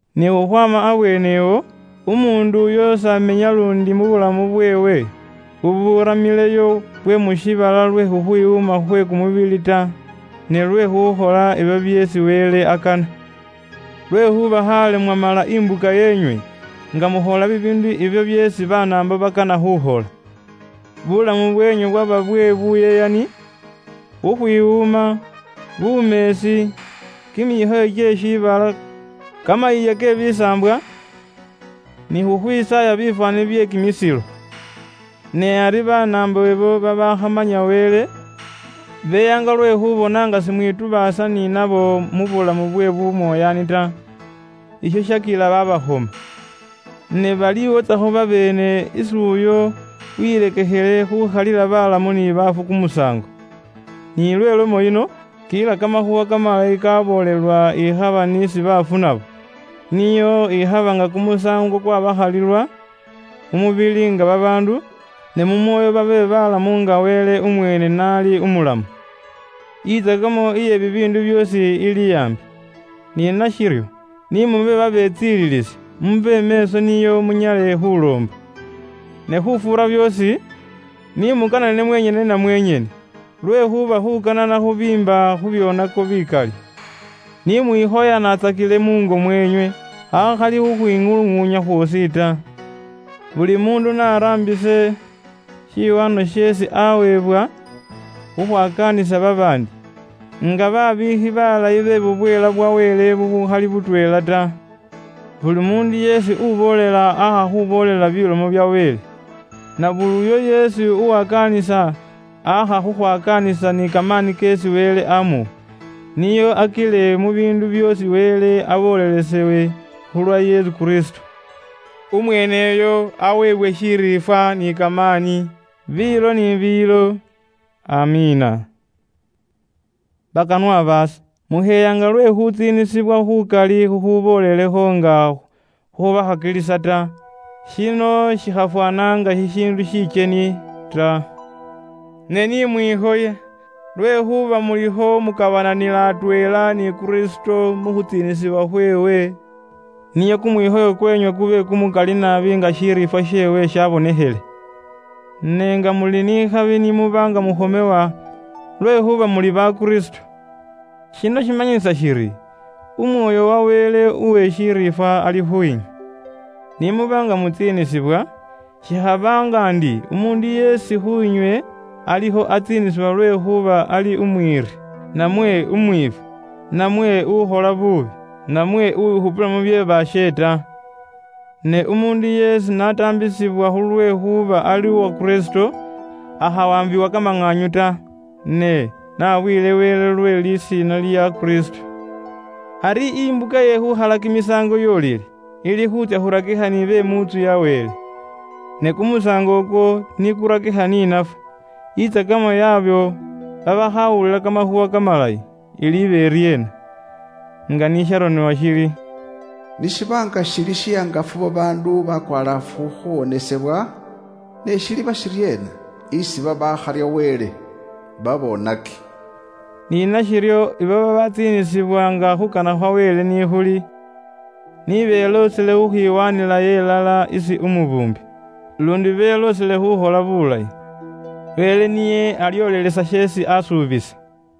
Ni khukhwaama abweenewo, umuundu uyo s'amenya luundi bulamu bweewe buburamileyo bwe mu shiibala lwe khukhwiwuuma khwe kumubili ta, ne lwe khuukhola ibyo byeesi Wele akana. Lwekhuuba khaale mwamala imbuka yeenywe nga mukhola bibiindu ibyo byeesi Banaambo bakana khukhola. Bulamu bweenywe bwaba bwe buyeyani, khukhwiwuuma, bumeesi, kimikhoyo kye shiibala, kamayiiya ke bisaambwa, ni by'embikho bye khukhwisaaya bifwaani. Ne ari Banaambo beyaanga lwe khuubona nga simwitubaasa ni nabo mu bulamu bwe bumoyaani naluundi bubukhomyaasa ta. Isho shaakila babaakhoma inywe. Ne baliiwotsakho babeene isi uyo uwilekekhele khuukhalila baalamu ni baafu kumusaango. Ni lwe lomo yino, kila kamakhuuwa kamalayi kaboolelwa ikhaba n'isi bafu nabo, nio ikhaba nga kumusaango kwabakhalilwa mu mubili nga babaandu, ne mu mwoyo babe balamu nga Wele umweene n'ali umulamu. Intsakamo iye bibiindu byoosi ili aambi. Ni nashiryo, ni mube babetsililisi, mube meeso nio munyale khuloomba. Ne khufuura byoosi, ni mukanane mwenyene na mwenyene, lwekhuuba khuukana khubiimba khu byoonako bikali. Ni mwikhoyanatsakile muungo mweenywe akhali khukhwiŋuluŋuunya khwoosi ta. Buli muundu n'araambise shiwaanwa sheesi aaweebwa khukhwakaanisa babaandi, nga babiikhi baalayi be bubweela bwa Wele bubuukhali butweela ta. Buli muundu yeesi uboolela aakha khuuboolela bilomo bya Wele. Na buli uyo yeesi uwakaanisa, aakha khukhwakaanisa ni kamaani keesi Wele amuwa, nio akile mu biindu byoosi Wele aboolelesewe khulwa Yesu Kristo. Umweeneyo aweebwe shiriifwa ni kamaani, biilo ni biilo. AMIINA. Bakanwa baase, mukheyaanga lwe khuutsiinisibwa khuukali khukhuuboolelekho nga khubakhakilisa ta. Shino shikhafwaana nga shishiindu shikyeni ta. Ne ni mwikhoye lwekhuuba mulikho mukabananila atweela ni Kristo mu khutsiinisibwa khweewe, nio kumwikhoyo kweenywe kube kumukali naabi nga shiriifwa sheewe shabonekhele. Ne nga muli ni khabi ni muba nga mukhomewa lwekhuuba muli ba Kristo! Shino shimanyisa shiri Umwoyo wa Wele uwe shiriifwa ali khwiinywe. Ni muba nga mutsiinisibwa, shikhaba nga ndi umuundu yeesi khwiinywe alikho atsiinisibwa lwekhuuba ali umwiiri, namwe umwiifwi, namwe ukhola buubi, namwe uwikhupila mu bye baashe ta. Ne umuundu yeesi n'ataambisibwa khulwekhuuba ali uwa Kristo, akhawaambiwa kamaŋaanyu ta, ne n'abuyile Wele lwe lisiina lya Kristo. Ari imbuka ye khuukhala kimisaango yoolile, ili khuutsya khurakikha ni be mu ntsu ya Wele. Ne kumusaango ukwo ni kurakikha ni nafwe, intsakamo yaabo babaakhawulila kamakhuuwa kamalayi, iliiba iryeena? Nga ni sharonebwa shiri, “Ni shiba nga shili shihangafu babaandu bakwalaafu khuuwonesebwa, ne shiliiba shiryeena isi babaakharya Wele ta, baboonaki?” Ni nashiryo abo babaatsiinisibwa nga khuukana khwa Wele ni khuli, ni beloosele khukhwiwaanilayo ilala kimyoyo kyaabwe isi umubuumbi, luundi beloosele khuukhola biilayi. Wele niye alyoolelesa sheesi aasuubisa.